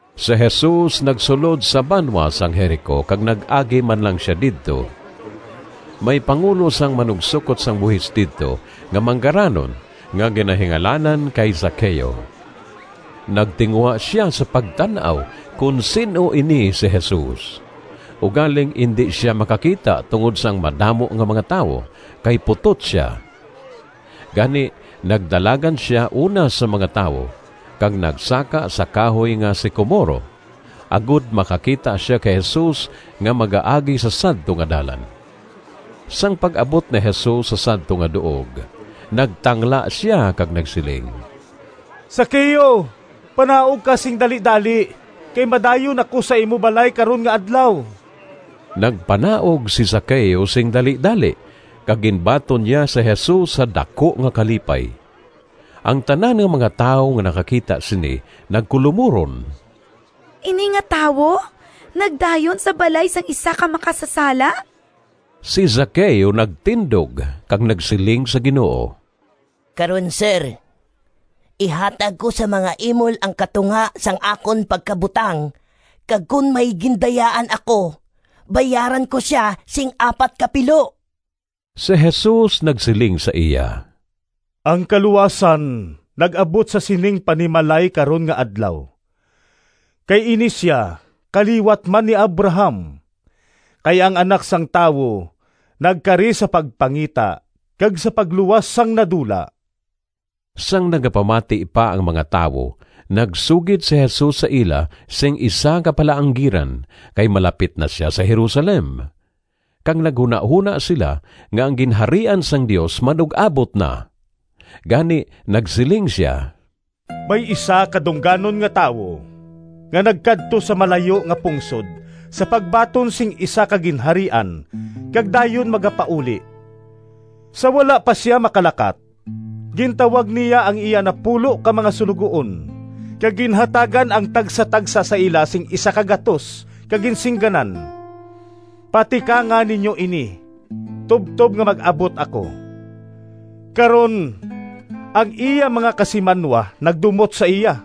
Si Jesus nagsulod sa banwa sang Jerico kag nag-agi man lang sia didto. May pangulo sang manugsokot sang buhis didto nga manggaranon nga ginahingalanan kay Zaqueo. Nagtinguha sia sa pagtan-aw kon sin-o ini si Jesus, ugaling indi sia makakita tungod sang madamo nga mga tawo kay putot sia. Gani nagdalagan sia una sa mga tawo kag nagsaka sa kahoy nga sikomoro, agod makakita sia kay Jesus nga magaagi sa sadto nga dalan. Sang pag-abot ni Jesus sa sadto nga duog nagtangla sia kag nagsiling, “Zaqueo, panaog ka sing dalidali, kay madayon ako sa imo balay karon nga adlaw.” Nagpanaog si Zaqueo sing dalidali kag ginbaton niya si Jesus sa daku nga kalipay. Ang tanan nga mga tawo nga nakakita sini nagkulomuron, “Ini nga tawo nagdayon sa balay sang isa ka makasasala.” Si Zaqueo nagtindog kag nagsiling sa Ginoo, “Karon, Sir, ihatag ko sa mga imol ang katunga sang akon pagkabutang kag kon may gindayaan ako, bayaran ko sia sing apat ka pilo.” Si Jesus nagsiling sa iya, “Ang kaluwasan nag-abot sa sining panimalay karon nga adlaw, kay ini sia kaliwat man ni Abraham. Kay ang Anak sang Tawo nagkari sa pagpangita kag sa pagluwas sang nadula.” Sang nagapamati pa ang mga tawo nagsugid si Jesus sa ila sing isa ka palaanggiran kay malapit na sia sa Jerusalem, kag naghunahona sila nga ang Ginharian sang Dios manug-abot na. Gani nagsiling sia, “May isa ka dungganon nga tawo nga nagkadto sa malayo nga pungsod sa pagbaton sing isa ka ginharian kag dayon magapauli. Sa wala pa sia makalakat, gintawag niya ang iya napulo ka mga suloguon kag ginhatagan ang tagsatagsa sa ila sing P100 kag ginsingganan, ‘Patikanga ninyo ini tubtob nga mag-abot ako.’ Karon, ang iya mga kasimanwa nagdumot sa iya,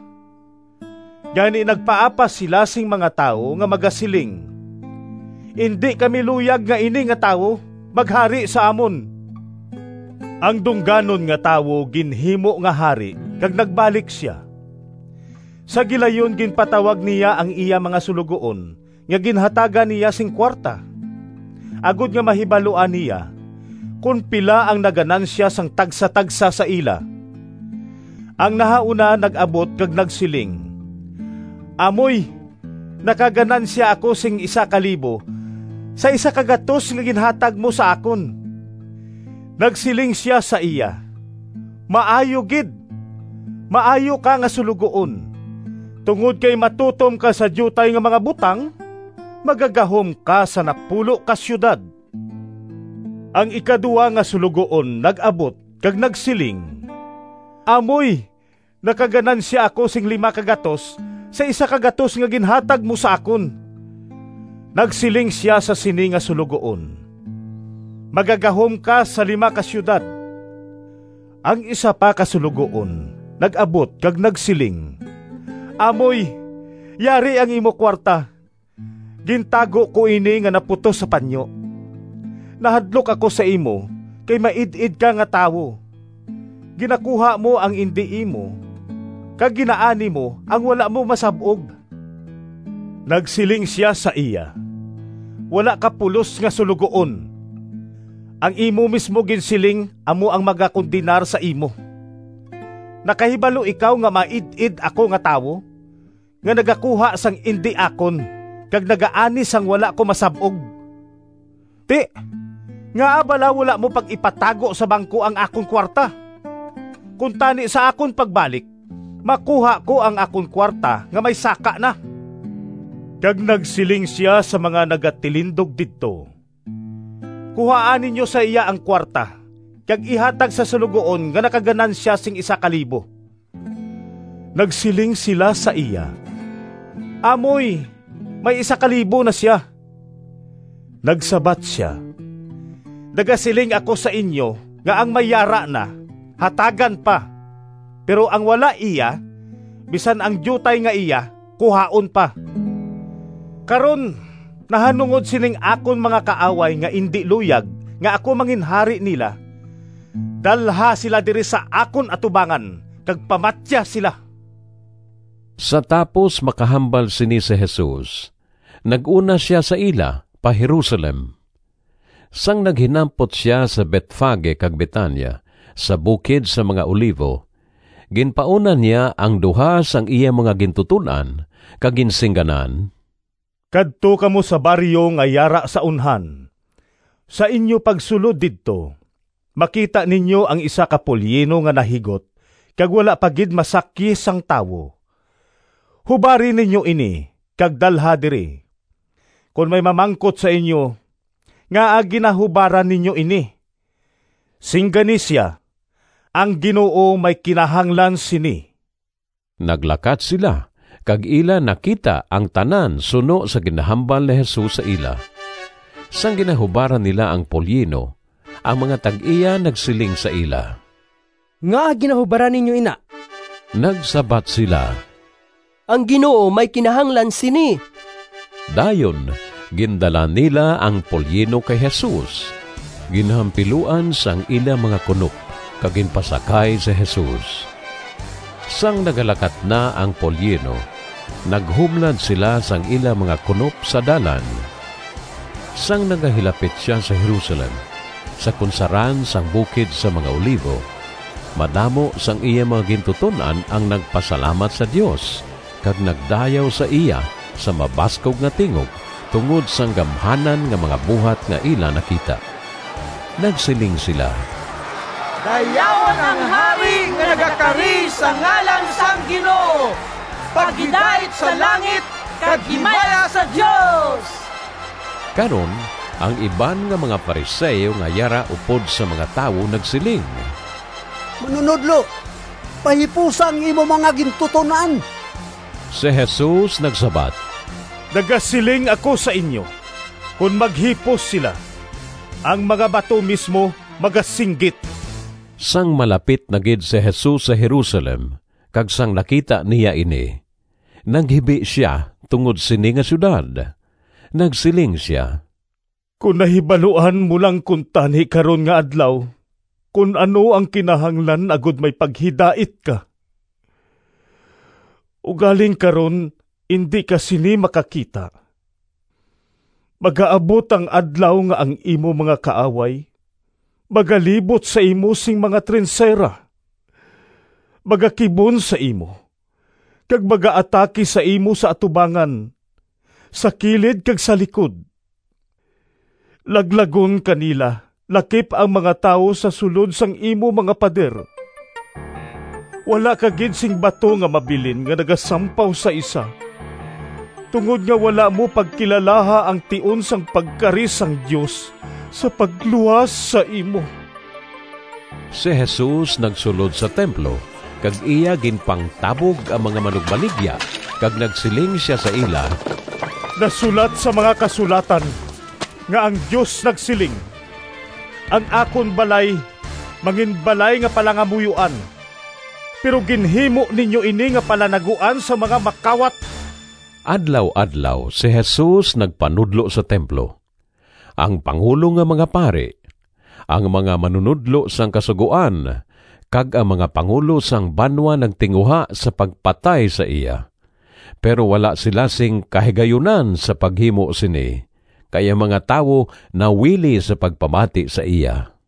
gani nagpaapas sila sing mga tawo nga magasiling, ‘Indi kami luyag nga ini nga tawo maghari sa amon.’ “Ang dungganon nga tawo ginhimo nga hari kag nagbalik sia. Sa gilayon ginpatawag niya ang iya mga suloguon nga ginhatagan niya sing kuwarta, agod nga mahibaluan niya kon pila ang naganansya sang tagsatagsa sa ila. Ang nahauna nag-abot kag nagsiling, ‘Amoy, nakaganansya ako sing P1,000 sa P100 nga ginhatag mo sa akon.’ Nagsiling sia sa iya, ‘Maayo gid! Maayo ka nga suloguon! Tungod kay matutom ka sa diutay nga mga butang, magagahom ka sa napulo ka siyudad.’ Ang ikaduha nga suloguon nag-abot kag nagsiling, ‘Amoy, nakaganansya ako sing P500 sa P100 nga ginhatag mo sa akon.’ Nagsiling sia sa sini nga suloguon, ‘Magagahom ka sa lima ka siyudad.’ Ang isa pa ka suloguon nag-abot kag nagsiling, ‘Amoy, yari ang imo kuwarta. Gintago ko ini nga naputos sa panyo. Nahadlok ako sa imo kay maid-id ka nga tawo. Ginakuha mo ang indi imo, kag ginaani mo ang wala mo masab-og.’ Nagsiling sia sa iya, ‘Wala ka pulos nga suloguon! Ang imo mismo ginsiling amo ang magakondenar sa imo. Nakahibalo ikaw nga maid-id ako nga tawo, nga nagakuha sang indi akon kag nagaani sang wala ko masab-og. Ti, ngaa bala wala mo pag-ipatago sa bangko ang akon kuwarta? Kuntani sa akon pagbalik makuha ko ang akon kuwarta nga may saka na.’ Kag nagsiling sia sa mga nagatilindog didto, ‘Kuhaa ninyo sa iya ang kuwarta kag ihatag sa suloguon nga nakaganansya sing P1,000.’ Nagsiling sila sa iya, ‘Amoy, may P1,000 na sia!’ Nagsabat sia, ‘Nagasiling ako sa inyo nga ang may yara na, hatagan pa, pero ang wala iya, bisan ang diutay nga iya kuhaon pa. Karon, nahanungod sining akon mga kaaway nga indi luyag nga ako manginhari nila, dalha sila diri sa akon atubangan kag pamatya sila.’” Sa tapos makahambal sini si Jesus, nag-una sia sa ila pa Jerusalem. Sang naghinampot sia sa Betfage kag Betania, sa bukid sang mga Olivo, ginpauna niya ang duha sang iya mga gintuton-an kag ginsingganan, “Kadto kamo sa baryo nga yara sa unhan. Sa inyo pagsulod didto makita ninyo ang isa ka polyino nga nahigot kag wala pa gid masakyi sang tawo. Hubari ninyo ini kag dalha diri. Kon may mamangkot sa inyo, ‘Ngaa ginahubaran ninyo ini?’ singgani sia, ‘Ang Ginoo may kinahanglan sini.’” Naglakat sila kag ila nakita ang tanan suno sa ginhambal ni Jesus sa ila. Sang ginahubaran nila ang polyino, ang mga tag-iya nagsiling sa ila, “Ngaa ginahubaran ninyo ina?” Nagsabat sila, “Ang Ginoo may kinahanglan sini.” Dayon gindala nila ang polyino kay Jesus, ginhampiluan sang ila mga kunop kag ginpasakay si Jesus. Sang nagalakat na ang polyino naghumlad sila sang ila mga kunop sa dalan. Sang nagahilapit sia sa Jerusalem, sa kunsaran sang bukid sang mga Olivo, madamo sang iya mga gintuton-an ang nagpasalamat sa Dios kag nagdayaw sa iya sa mabaskog nga tingog tungod sang gamhanan nga mga buhat nga ila nakita. Nagsiling sila, “Dayawon ang Hari nga nagakari sa ngalan sang Ginoo! Paghidait sa langit, kag himaya sa Dios!” Karon ang iban nga mga Fariseo nga yara upod sa mga tawo nagsiling, “Manunodlo, pahipusa ang imo mga gintuton-an.” Si Jesus nagsabat, “Nagasiling ako sa inyo, kon maghipos sila, ang mga bato mismo magasinggit!” Sang malapit na gid si Jesus sa Jerusalem kag sang nakita niya ini, naghibi sia tungod sini nga siyudad. Nagsiling sia, “Kon nahibaluan mo lang kuntani karon nga adlaw kon ano ang kinahanglan agod may paghidait ka! Ugaling karon indi ka sini makakita. Magaabot ang adlaw nga ang imo mga kaaway magalibot sa imo sing mga trinsera, magakibon sa imo, kag magaatake sa imo sa atubangan, sa kilid kag sa likod. Laglagon ka nila lakip ang mga tawo sa sulod sang imo mga pader. Wala ka gid sing bato nga mabilin nga nagasampaw sa isa, tungod nga wala mo pagkilalaha ang tion sang pagkari sang Dios sa pagluwas sa imo!” Si Jesus nagsulod sa templo kag iya ginpangtabog ang mga manugbaligya kag nagsiling sia sa ila, “Nasulat sa mga Kasulatan nga ang Dios nagsiling, ‘Ang akon balay manginbalay nga palangamuyoan.’ Pero ginhimo ninyo ini nga palanaguan sang mga makawat.” Adlaw-adlaw si Jesus nagpanudlo sa templo. Ang pangulo nga mga pari, ang mga manunodlo sang Kasugoan, kag ang mga pangulo sang banwa nagtinguha sa pagpatay sa iya, pero wala sila sing kahigayunan sa paghimo sini, kay ang mga tawo nawili sa pagpamati sa iya.